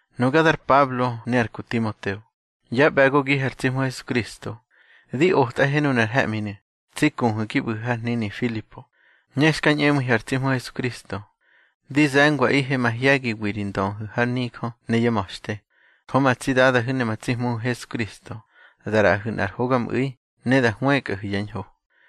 Nuga dar Pablo ne ar ku Timoteo, yá ꞌbe̱gogihe ar tsi Hmu Hesukristo, di otꞌahe nunar he̱ꞌminu̱, tsi kuhu̱ gi ꞌbu̱hu̱ har hnini Filipo, ne xka ñꞌemu̱ihu̱ ar tsi Hmu Hesukristo. Di ze̱ngwaꞌihe mahye̱giwi ri ndöhu̱ har nijö ne yá ma̱xte. Jö ma tsi Dadahu̱ ne ma tsi Hmuhu̱ Hesukristo da ꞌraꞌahu̱ nꞌar hogamꞌu̱i ne da hwëkꞌahu̱ yá ñho.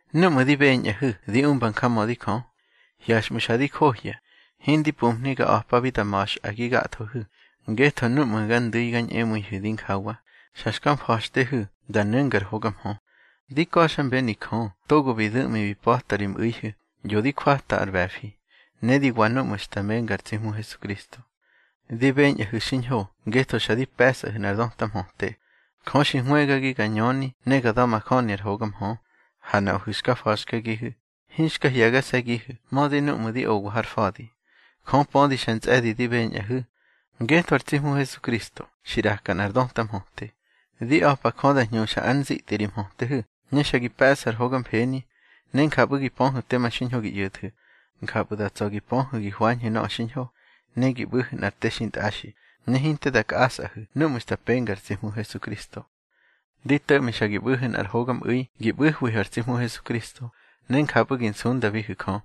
Núꞌmu̱ di beñꞌahu̱ di umba njamödi Jö. Hyaxꞌmu̱ xa di johya hindi pumhni ga a̱pabi da ma̱xꞌa gi gathohu̱. Ngetho núꞌmu̱ ga ndu̱i ga ñꞌemu̱ihu̱ dinjawa, xa xka mfa̱xtehu̱ da nu̱nga ar hoga mhö. Di ka̱xmbeni Jö togo bi du̱ꞌmi bi pa̱ta ri mꞌu̱ihu̱, ꞌyo di jwata ar ꞌbe̱fi, ne di wa núꞌmu̱ xta menga ar tsi Hmu Hesukristo. Di beñꞌahu̱ xiñho ngetho xa di pe̱sꞌahu̱ nꞌar döta mhöte. Jö xi hwëgagi ga ñöni ne ga da̱majöni ar hoga mhö. Ha nuꞌahu̱ xka fa̱xkagihu̱, hinxka hye̱gase̱gihu̱ mödi núꞌmu̱ di owa har fa̱di. Jö pödi xa ntsꞌe̱di di beñꞌahu̱, ngetho ar tsi Hmu Hesukristo xi ꞌraka nꞌar döta mhöte. Di a̱pa Jö da hñuxa ár nzitꞌi ri mhötehu̱, ne xa gi pe̱ꞌsu̱ ar hoga mfeni, ne njapꞌu̱ gi pöhu̱ tema xiñho gi ꞌyo̱thu̱. Njapꞌu̱ da tsa̱ gi pöhu̱ gi hwañhu̱ nöꞌö xiñho, ne gi ꞌbu̱hu̱ nꞌar te xintꞌaxi, ne hinte da kꞌasꞌahu̱ núꞌmu̱ xta penga ar tsi Hmu Hesukristo. Di to̱ꞌmi xa gi ꞌbu̱hu̱ nꞌar hogamꞌu̱i gi ꞌbu̱hwihu̱ ar tsi Hmu Hesukristo, ne njapꞌu̱ gi nsundabihu̱ Jö.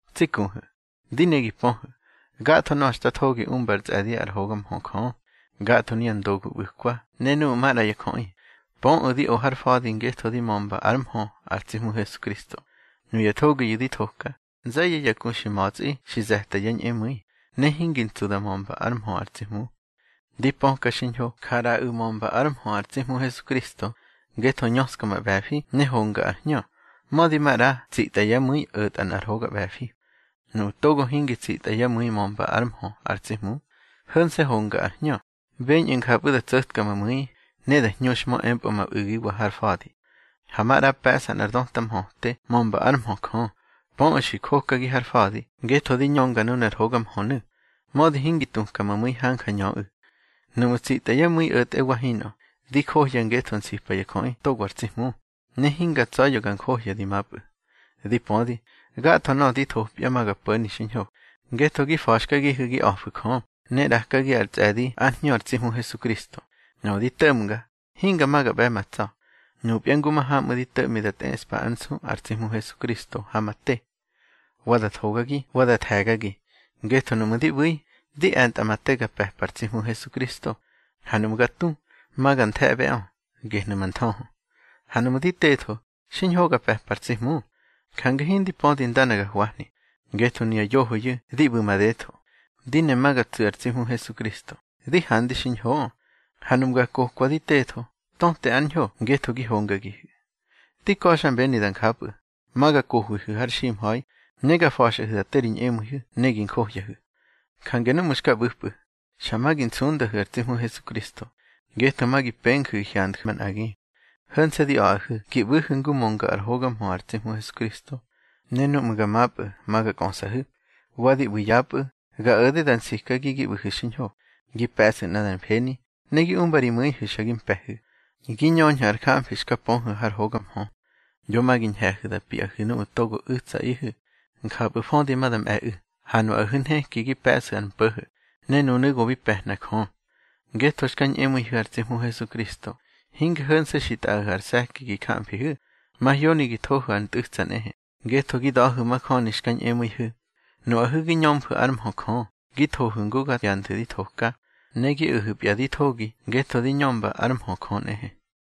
Tsi kuhu̱, di ne gi pöhu̱, gatho nöꞌö xta thogi umba ar tsꞌe̱di ár hoga mhö Jö. Gatho nuya ndogu ꞌbu̱kwa ne nuꞌu̱ maꞌra ya jöꞌi, pöꞌu̱ di o har fa̱di ngetho di mömba ár mhö ar tsi Hmu Hesukristo. Nuya thogiyu̱ di thoka, nze̱ye̱ ya ku xi ma̱tsꞌi xi ze̱ta yá ñꞌemu̱i, ne hingi ntsu da mömba ár mhö ar tsi Hmu. Di pöka xiñho ja ꞌraꞌu̱ mömba ár mhö ar tsi Hmu Hesukristo, ngetho ñöska ma ꞌbe̱fi ne honga ar hñö, mödi maꞌra tsitꞌa yá mu̱i o̱tꞌa nꞌar hoga ꞌbe̱fi. Nuꞌu̱ togo hingi tsitꞌa yá mu̱i mömba ár mhö ar tsi Hmu, ho̱nse̱ honga ar hñö, beñꞌu̱ njapꞌu̱ da tso̱tka ma mu̱i, ne da hñuxhmö empꞌö ma u̱giwa har fa̱di. Ha maꞌra pe̱ꞌsa nꞌar döta mhöte mömba ár mhö Jö, pöꞌu̱ xi jokagi har fa̱di ngetho di ñönga nunar hoga mhönu̱. Mödi hingi tuka ma mu̱i hanja ñöꞌu̱, nuꞌmu̱ tsitꞌa yá mu̱i o̱tꞌe wa hinꞌö. Di johya ngetho nsipa ya jöꞌi togo ar tsi Hmu, ne hinga tsa̱ya̱ ga njohya di mapꞌu̱. Di pödi, gatho nöꞌö di thopya ma ga po̱ni xiñho, ngetho gi fa̱xkagihu̱ gi a̱fu̱ Jö, ne ꞌrakagi ar tsꞌe̱di ár Hñö ar tsi Hmu Hesukristo. Nöꞌö di to̱ꞌmga, hinga ma ga ꞌbe̱ ma tsa̱. Nupya ngu mahamꞌu̱ di to̱ꞌmi da tꞌeꞌspa ár nsu ar tsi Hmu Hesukristo ha ma te, wa da thogagi wa da the̱gagi. Ngetho nuꞌmu̱ di ꞌbu̱i, di e̱ntꞌa ma te ga pe̱pa ar tsi Hmu Hesukristo, ha nuꞌmu̱ ga tu, ma ga nthe̱ꞌbeꞌö, gehnu̱ ma nthöhö. Ha nuꞌmu̱ di tetho, xiñho ga pe̱pa ar tsi Hmu. Jange hindi pödi ndana ga hwahni. Ngetho nuya yohoyu̱ di ꞌbu̱ madetho. Di ne ma ga tsu̱ ar tsi Hmu Hesukristo, di handi xiñhoꞌö. Ha nuꞌmu̱ ga kokwa di tetho, töte ár ñho ngetho gi hongagihu̱. Di ka̱xmbeni da njapꞌu̱, ma ga kohwihu̱ har ximha̱i, ne ga fa̱xꞌahu̱ da te ri ñꞌemu̱ihu̱ ne gi njohyahu̱. Jange núꞌmu̱ xka ꞌbu̱pꞌu̱, xa ma gi nsundahu̱ ar tsi Hmu Hesukristo, ngetho ma gi penju̱ gi hyandju̱ manꞌagi. Ho̱nse̱ di a̱ꞌahu̱ gi ꞌbu̱hu̱ ngu mönga ár hoga mhö ar tsi Hmu Hesukristo. Ne núꞌmu̱ ga mapꞌu̱ ma ga kꞌösꞌahu̱, wa di ꞌbu̱ yapꞌu̱, ga o̱de da nsikagi gi ꞌbu̱hu̱ xiñho, gi pe̱ꞌsu̱ nꞌadar mfeni, ne gi umba ri mu̱ihu̱ xa gi mpe̱hu̱, gi ñöñhu̱ ar jamfi xta pöhu̱ har hoga mhö. Yo ma gi ñhe̱hu̱ da piꞌahu̱ nuꞌu̱ togo u̱tsaꞌihu̱. Njapꞌu̱ födi ma da mꞌe̱ꞌu̱, ha nuꞌahu̱ nheki gi pe̱ꞌsu̱ ar mpo̱ho̱, ne nunu̱ go bi pe̱hna Jö. Ngetho xka ñꞌemu̱ihu̱ ar tsi Hmu Hesukristo, hinge ho̱nse̱ xi tꞌaꞌahu̱ ar se̱ki gi jamfihu̱. Mahyoni gi thohu̱ ar ntꞌu̱tsa nꞌehe, ngetho gi da̱hu̱ majöni xka ñꞌemu̱ihu̱. Nuꞌahu̱ gi ñömfu̱ ár mhö Jö, gi thohu̱ ngu ga hyanthu̱ ndi thoka, ne gi o̱hu̱pya di thogi ngetho di ñömba ár mhö Jö nꞌehe.